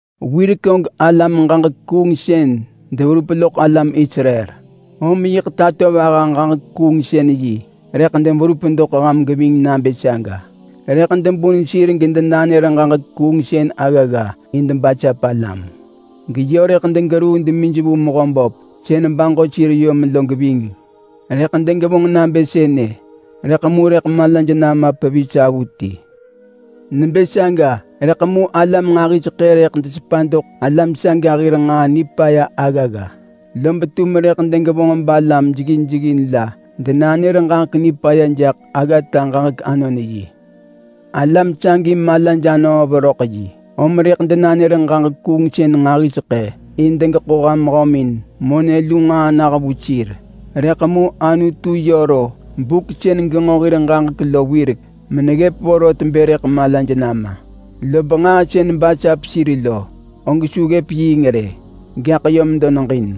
Wirek og alam-ġaġek-kuungsën deverup loḳ alam Israel, om yiḳ tatovaha-ġaġek-kuungsën-yi rëḳ deberup doḳ ham geving nabë saga. Rëḳ debun sir gedenanër ġaġek kuungsën aggagga in debasap alam, geyö rëḳ degeruu demij vu Mehöböp sën baġo sir yom lo geving. Rëḳ degevonġ nabë sënë, rëḳ mu rëḳ malaj nama pevis avuti. Nebë saga rëḳ mu alam nġahiseḳë rëḳ desepa doḳ alam saga hir nġaa nipaya aggagga, lob tum rëḳ degevonġ balam jeggin jeggin la denanër ġaġek nipaya jaḳ aggata-ġaġek-anon-yi. Alam sagi malaj anöö veröḳ yi, om rëḳ denanër ġaġek kuungsën nġahiseḳë in degeḳo ham hömin monë lu nġaa nah vu sir. Rëḳ mu Anutu yö ro buk sën genġo hir ġaġek lo wirek meneggëp vorot bë rëḳ malaj nama. Lob nġaa sën basap sir lo, og su ggëp yiing rë, gaḳ yö medo neġin.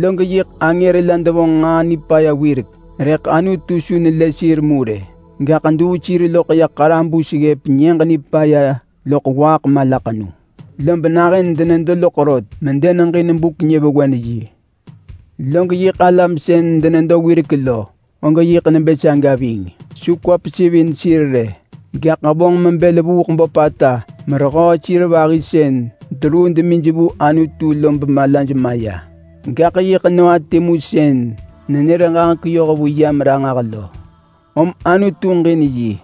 Log yiḳ angër la devonġ nġaa nipaya wirek, rëḳ Anutu su nelë sir mu rë. Gaḳ duu sir loḳ ya ḳarabus ggëp Nyëġ Nipaya loḳ waaḳ malaḳenu. Lob nahën denedo loḳ rot medeneġin buk-nyëvewen-yi. Log yiḳ alam sën denedo wirek lo, og yiḳ nebë saga ving. Su kwa pesivin sir rë. gaḳ vonġ mebël vuuḳ böpata merehöö sir vahi sën deruu demij vu Anutu lo bemalaj maya. Gaḳ yiḳ Noa timu sën nenër ġaġek yohvu yam ranġah lo, om Anutu ġin yi,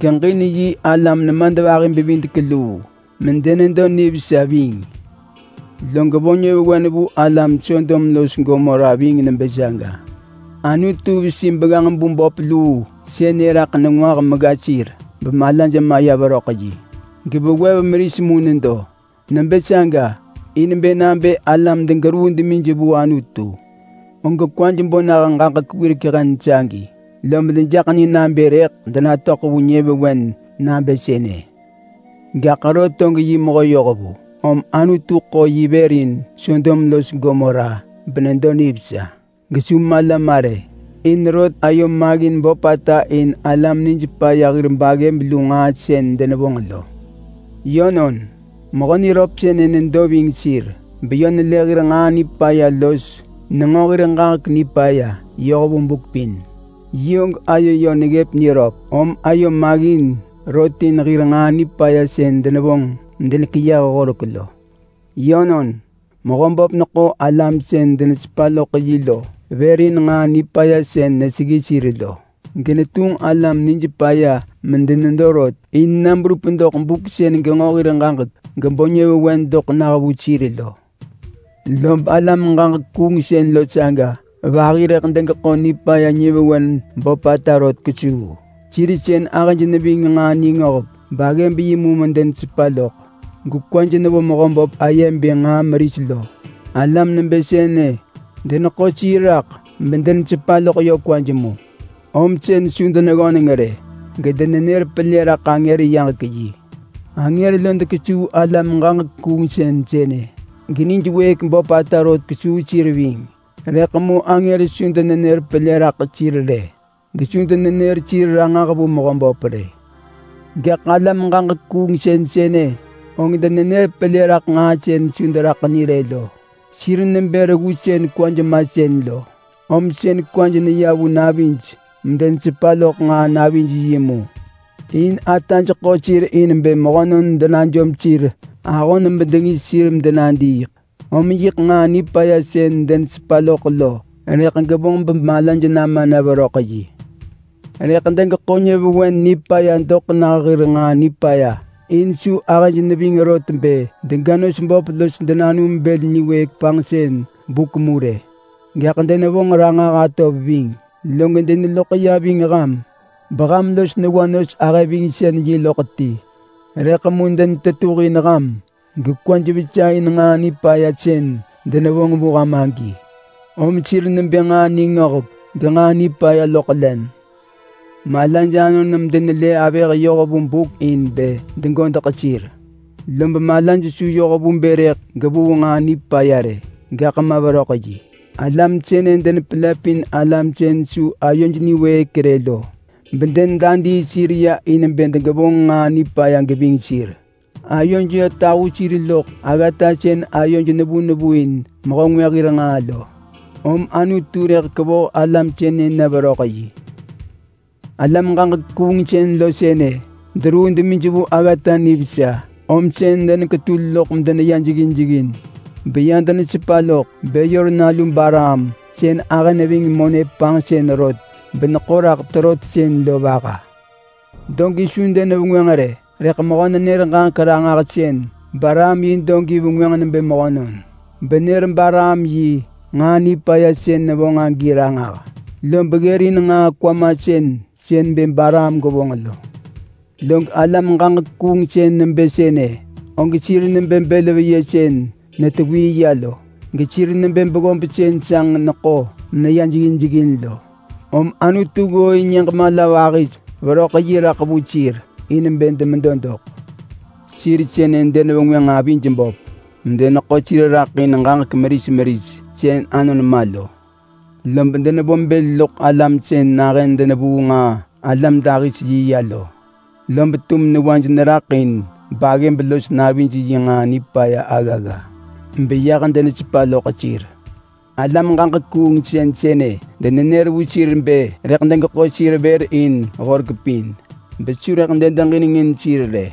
geġin yi alam nemadvahi-bevidek-luu medenedo nivesa ving. Log vo nyëvewen vu alam Sodom los Gomora ving nebë saga. Anutu vesi begganġ bu böp luu sënë raḳ nengwah megga sir bemalaj maya veröḳ yi. Gevewev meris mu nedo. Nebë saga in bë nabë alam degeruu demij vu Anutu, og kwaj bo nah ġaġek wirek hen sagi, lob dejaḳ ni nabë rëḳ denatöḳ vu nyëvewen nabë sënë. Gaḳ Lot og yi mehö yohvu, om Anutu ḳo yi vër in Sodom los Gomora, benedo nivesa gesu mala ma rë. In Lot ayo maggin böpata in alam nij paya hir baggëb lu nġaa sën denevonġ lo. Yönon, mehö niröp sënë nedo ving sir beyö nelë hir nġaa nipaya los nenġo hir ġaġek nipaya yoh vu buk pin. Yi og ayo yö neggëp niröp, om ayo maggin rot in hir nġaa nipaya sën denevonġ medenekeyëh horek lo. Yönon, Mehöböp neḳo alam sën denesepa loḳ yi lo vër in nġaa nipaya sën neseggi sir lo, genetunġ alam nij paya medenedo rot in na berup doḳ buk sën genġo hir ġaġek gebo nyëvewen doḳ nah vu sir lo. Lob alam-ġaġek-kuungsën lo saga vahi rëḳ degeḳo nipaya nyëvewen böpata rot kesuu. Sir sën ahëj neving nġaa-ningöhek-baggëb-yi mu medenesepa loḳ, gekwaj nevo Mehöböp aye bë nġaa meris lo. Alam nebë sënë deneḳo sir raḳ bedenesepa loḳ yö kwaj mu. Om sën su deneggöneng rë, gedenenër pelë raḳ angër yaġek yi. Angër lo dekesuu alam ġaġek kuungsën sënë, genij wëëk böpata rot kesuu sir ving. Rëḳ mu su denenër pelë raḳ sir rë, gesu denenër sir ranġah vu Mehöböp rë. Gaḳ alam ġaġek kuungsën sënë, og denenër pelë raḳ nġaa sën su deraḳ ni rë lo. Sir nebë reggu sën kwaj masën lo, om sën kwaj neya vu navij medenesepa loḳ nġaa-navij-yi mu. In ataj ḳo sir in bë mehönon denajom sir ahon bedengis sir medenadiiḳ. Om yiḳ nġaa nipaya sën denesepa loḳ lo rëḳ gevonġ bemalaj nama na veröḳ yi. Rëḳ degeḳo nyëvewen nipaya doḳ nah hir nġaa nipaya. In su ahëj neving rot bë dega nos böp los denanum bël niwëëk panġsën buk mu rë, gaḳ denevonġ ranġah atov ving. Log deneloḳ ya ving ham beham los newa nos-ahëvingsën-yi loḳ ti. Rëḳ mu denetetuhin ham gekwaj vesa in nġaa nipaya sën denevonġ vu ham agi, om sir nebë nġaa ningöhek genġaa nipaya loḳ len. Malaj anon medenelë avëh yoh vu buk in bë degodeḳ sir. Lob malaj su yoh vu bë rëḳ gevuu nġaa nipaya rë, gaḳ ma veröḳ yi. Alam sënë denepelëpin alam sën su ayoj niwëëk rë lo, bedenedadii sir ya in bë degevonġ nġaa nipaya geving sir. Ayoj yö tahu sir loḳ aggata sën ayoj nevu nevu in mehö ngwë hir nġaa lo, om Anutu rëḳ kevoh alam sënë na veröḳ yi. Alam-ġaġek-kuungsën lo sënë deruu demij vu aggata nivesa, om sën deneketul loḳ medeneya jeggin jeggin, beya denesepa loḳ Beyor nalu Balaam sën ahë neving monë panġsën rot beneḳo raḳ terotsën lo vaha. Dogi su denevengwënġ rë, rëḳ mehö-nenër-ġaġek-ranġahsën Balaam yi dogi vengwënġ nebë mehönon benër Balaam yi nġaa nipaya sën nevonġ agi ranġah. Lob ggërin nġaa kwamasën sën bë gevonġ lo. Log alam-ġaġek-kuungsën nebë sënë, og sir nebë bël veyë sën netewii ya lo. Gesir nebë beggob sën sanġ neḳo meneya jeggin jeggin lo. Om Anutu ggooin nyëġ mala vahis veröḳ yi raḳ vu sir in bë demedo doḳ. Sir sënë denevengwënġ avij böp medeneḳo sir raḳ in ġaġek meris meris sën anon ma lo. Lob denevo bël loḳ alam sën nahën denevuu nġaa-alam dahis-yi ya lo, lob tum newaj neraḳ in baggëb los navij yi nġaa nipaya aggagga beyah denesepa loḳ sir. Alam ġaġek kuungsën sënë denenër vu sir bë rëḳ degeḳo sir vër in horek pin besu deġinengin sir rë.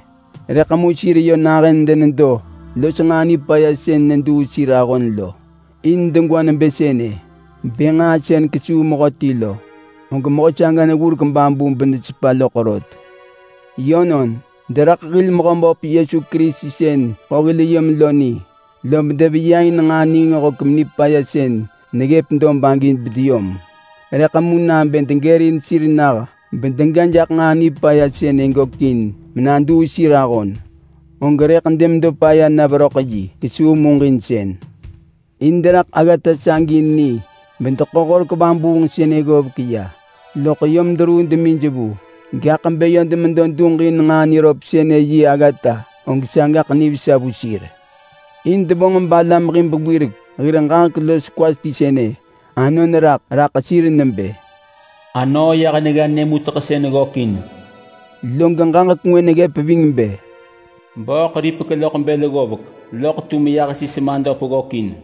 Rëḳ mu sir yö nahën denedo los nġaa nipaya sën neduu sir lo. In degwa nebë sënë bë nġaa sën kesuu mehöti lo, og mehö saga neggurek babu benesepa loḳ rot. Yönon, deraḳ hil Mehöböp Yesu Kerisi sën ḳo hil yom lo ni, lob deveya in nġaa ningöhek nipaya sën neggëp dob agi bedeyom. Rëḳ mu nabë degërin sir nah bedega jaḳ nġaa nipaya sënë gökin menaduu sir ahon, og rëḳ demedo paya na veröḳ yi kesuu muġinsën. In deraḳ aggata sagi ni bedeḳo horek vabuung sënë ggovek ya, loḳ yom deruu demij vu. Gaḳ bë yö demedo duġ in nġaa niröp sënë yi aggata, og sagaḳ nivesa vu sir. In devonġ balam hib wirek hir ġaġek los kwa ti sënë anon raḳ raḳ sir nebë, “Anöö yah negga nyë muteḳsën ggökin.” Log ġaġek ngwë neggëp ving bë, “Bööḳ ripek loḳ bël ggovek, loḳ tum yah sis madöp ggökin.”